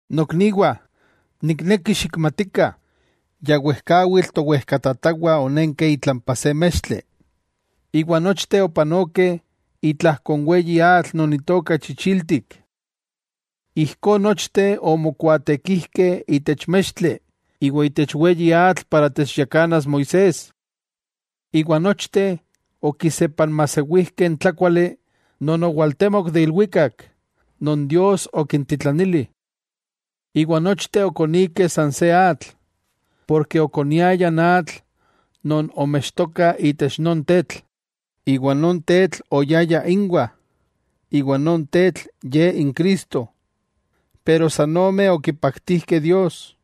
Nokniwah, nikneki xikmatikah, ya wejkawitl towejkatatawah onenkeh itlampa se mextli, iwa nochteh opanokeh itlajko n weyi atl non itoka chichiltik. Ijkó nochteh omokuaatekijkeh itech mextli iwa itech weyi atl para techyakanas Moisés. Iwa nochteh okisepanmajsewijkeh n tlákuali non owaltemok de ilwikak non Dios okintitlanili. Iwa nochteh okonikeh san se atl. Porke okoniayah n atl non omextoka itech non Tetl, iwa non Tetl oyaya inwah. Iwa non Tetl Ye n Cristo. Pero san ome okipaktijkeh Dios,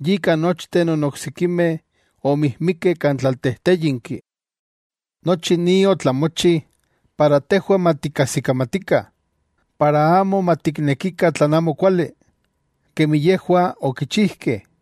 yika nochteh non oksikimeh omijmikeh kan tlaltejtéyinki. Nochi ni otlamochi para tejwah matikkajsikamatikah, para amo matiknekikah tlan amokuali, kemi yejwah okichijkeh.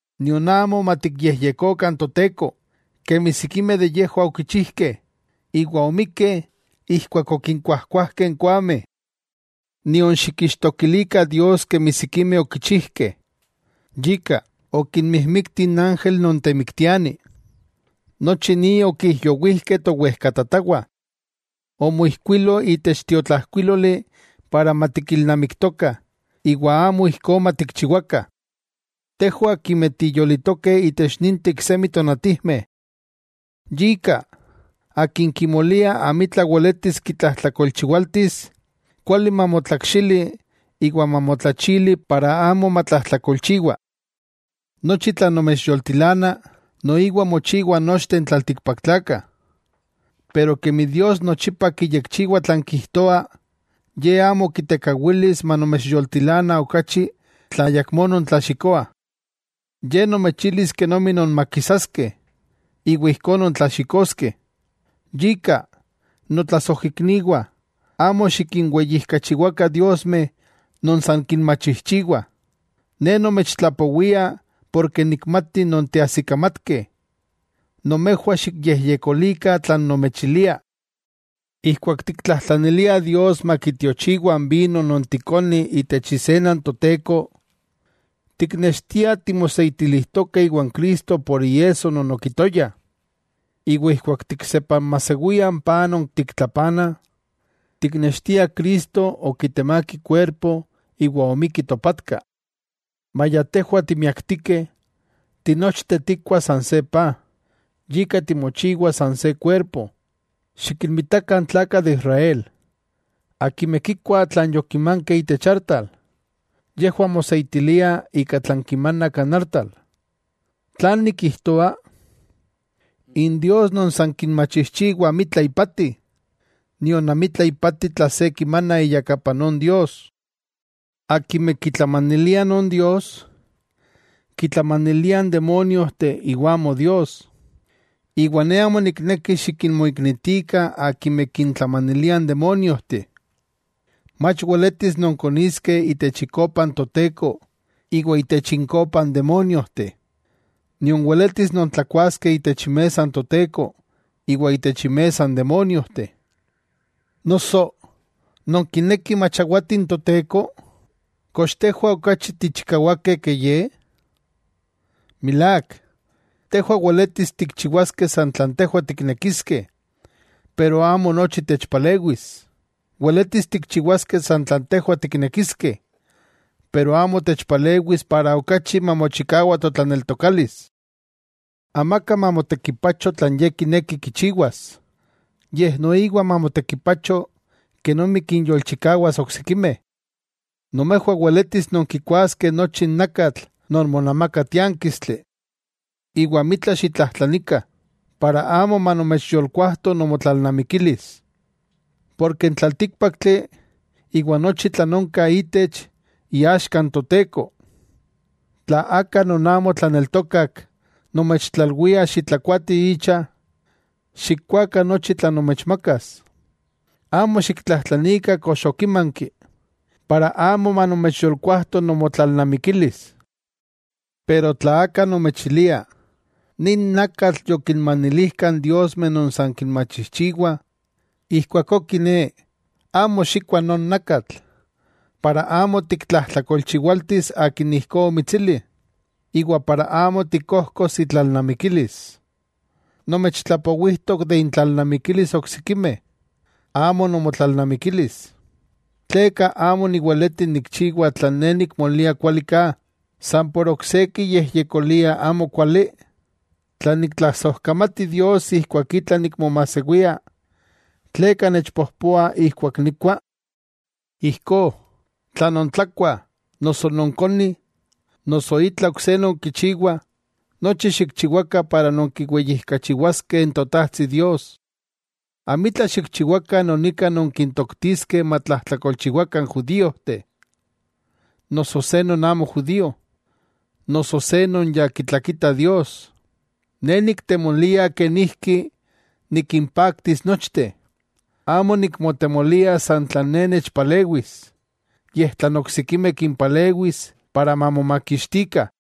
Nion amo matikyejyekokah n Toteko, kemi sikimeh de yejwah okichijkeh, iwa omikkeh ijkuak okinkuajkuajkeh n koameh. Nion xikixtokilikah Dios kemi sikimeh okichijkeh, yika okinmijmikti n ángel non temiktiani. Nochi ni okijyowijkeh towejkatatawah. Omoijkuilo itech tiotlajkuíloli para matikilnamiktokah iwa amo ijkó matikchiwakah, tejwah akimeh tiyolitokeh itech ninteh iksemi tonatijmeh. Yika, akin kimolia amitla weletis kitlajtlakolchiwaltis, kuali mamotlakxili iwa mamotlachili para amo matlajtlakolchiwa. Nochi tlan nomechyoltilana, noiwa mochiwah nochteh n tlaltikpaktlakah. Pero kemi Dios nochipa kiyekchiwa tlan kijtoa, Ye amo kitekawilis manomechyoltilana okachi tla ayakmó nontlaxikoah. Ye nomechilis kenomi nonmakisaskeh, iwa ijkó nontlaxikoskeh. Yika, notlasojikniwah amo xikinweyijkachiwakah diosmeh non san kinmachijchiwah. Ne nomechtlapowia porke nikmati nonteajsikamatkeh, nomejwah xikyejyekolikah tlan nomechilia. Ijkuak tiktlajtlaniliah Dios makitiochiwa n vino non tikonih itech isena n Toteko, tiknextiah timoseitilijtokeh iwan Cristo por iesso non okitoya. Iwa ijkuak tiksepanmajsewiah n paj non tiktlapanah, tiknextiah Cristo okitemák ikuerpo iwa omikki topatka. Maya tejwah timiaktikeh, tinochteh tikkuah san se paj, yika timochiwah san se kuerpo. Xikinmitakah n tlakah de Israel, akimeh kikuah tlan yokimankeh itech artal, yejwah moseitiliah ika tlan kimanah kan artal. ¿Tlan nikijtoa? N “dios” non san kinmachijchiwah amitla ipati, nion amitla ipati tlan se kimana iyakapa non “dios”. Akimeh kitlamaniliah non “dios” kitlamaniliah n demóniojteh iwa amo Dios, iwa ne amo nikneki xikinmoiknitikah akimeh kintlamanilia n demóniojteh. Mach weletis nonkoniskeh itech ikopa n Toteko, iwa itech inkopa n demóniojteh. Nion weletis nontlakuaskeh itech imesa n Toteko, iwa itech inmesa n demóniojteh. Noso, ¿nonkinekih machawati n Toteko? ¿Kox tejwah okachi tichikawakeh ke Ye? Milák, tejwah weletis tikchiwaskeh san tlan tejwah tiknekiskeh pero amo nochi techpalewis. Weletis tikchiwaskeh san tlan tejwah tiknekiskeh pero amo techpalewis para okachi mamochikawa totlaneltokalis. Amaka mamotekipacho tlan ye kineki kichiwas, yej noiwa mamotekipacho kenomi kinyolchikawas oksikimeh. Nomejwah weletis nonkikuaskeh nochi n nakatl non monamaka tiánkistli, iwa amitla xitlajtlanikah, para amo manomechyolkuajto nomotlalnamikilis. Porke n tlaltíkpaktli, iwa nochi tlan onka itech, iaxka n Toteko. Tla aka non amo tlaneltokak nomechtlalwia xitlakuatih icha, xikkuakah nochi tlan nomechmakas. Amo xiktlajtlanikah kox okimanki, para amo manomechyolkuajto nomotlalnamikilis. Pero tla aka nomechilia: “Nin nakatl yokinmanilijkah n diosmeh non san kinmachijchiwah.” Ijkuakó kiné amo xikkua non nakatl, para amo tiktlajtlakolchiwaltis akin ijkó omitsili, iwa para amo tikkojkos itlalnamikilis. Nomechtlapowijtok de intlannamikilis oksikimeh, amo nomotlalnamikilis. “¿Tleka amo niweleti nikchiwa tlan ne nikmolia kuali ka, san por ok se kiyejyekolia amokuali?” Tla niktlasojkamati Dios ijkuak itla nikmomajsewia, ¿tleka nechpojpoah ijkuak nikkua? Ijkó, tla nontlakuah, noso nonkonih, noso itla ok se nonkichiwah, nochi xikchiwakah para nonkiweyijkachiwaskeh n Totajtsi Dios. Amitla xikchiwakah non ika nonkintoktiskeh matlajtlakolchiwakah n judíojteh, noso se non amo judío, noso se non ya kitlakita Dios. Ne niktemolia kenijki nikimpaktis nochteh. Amo nikmotemolia san tlan ne nechpalewis, yej tlan oksikimeh kimpalewis para mamomakixtikah.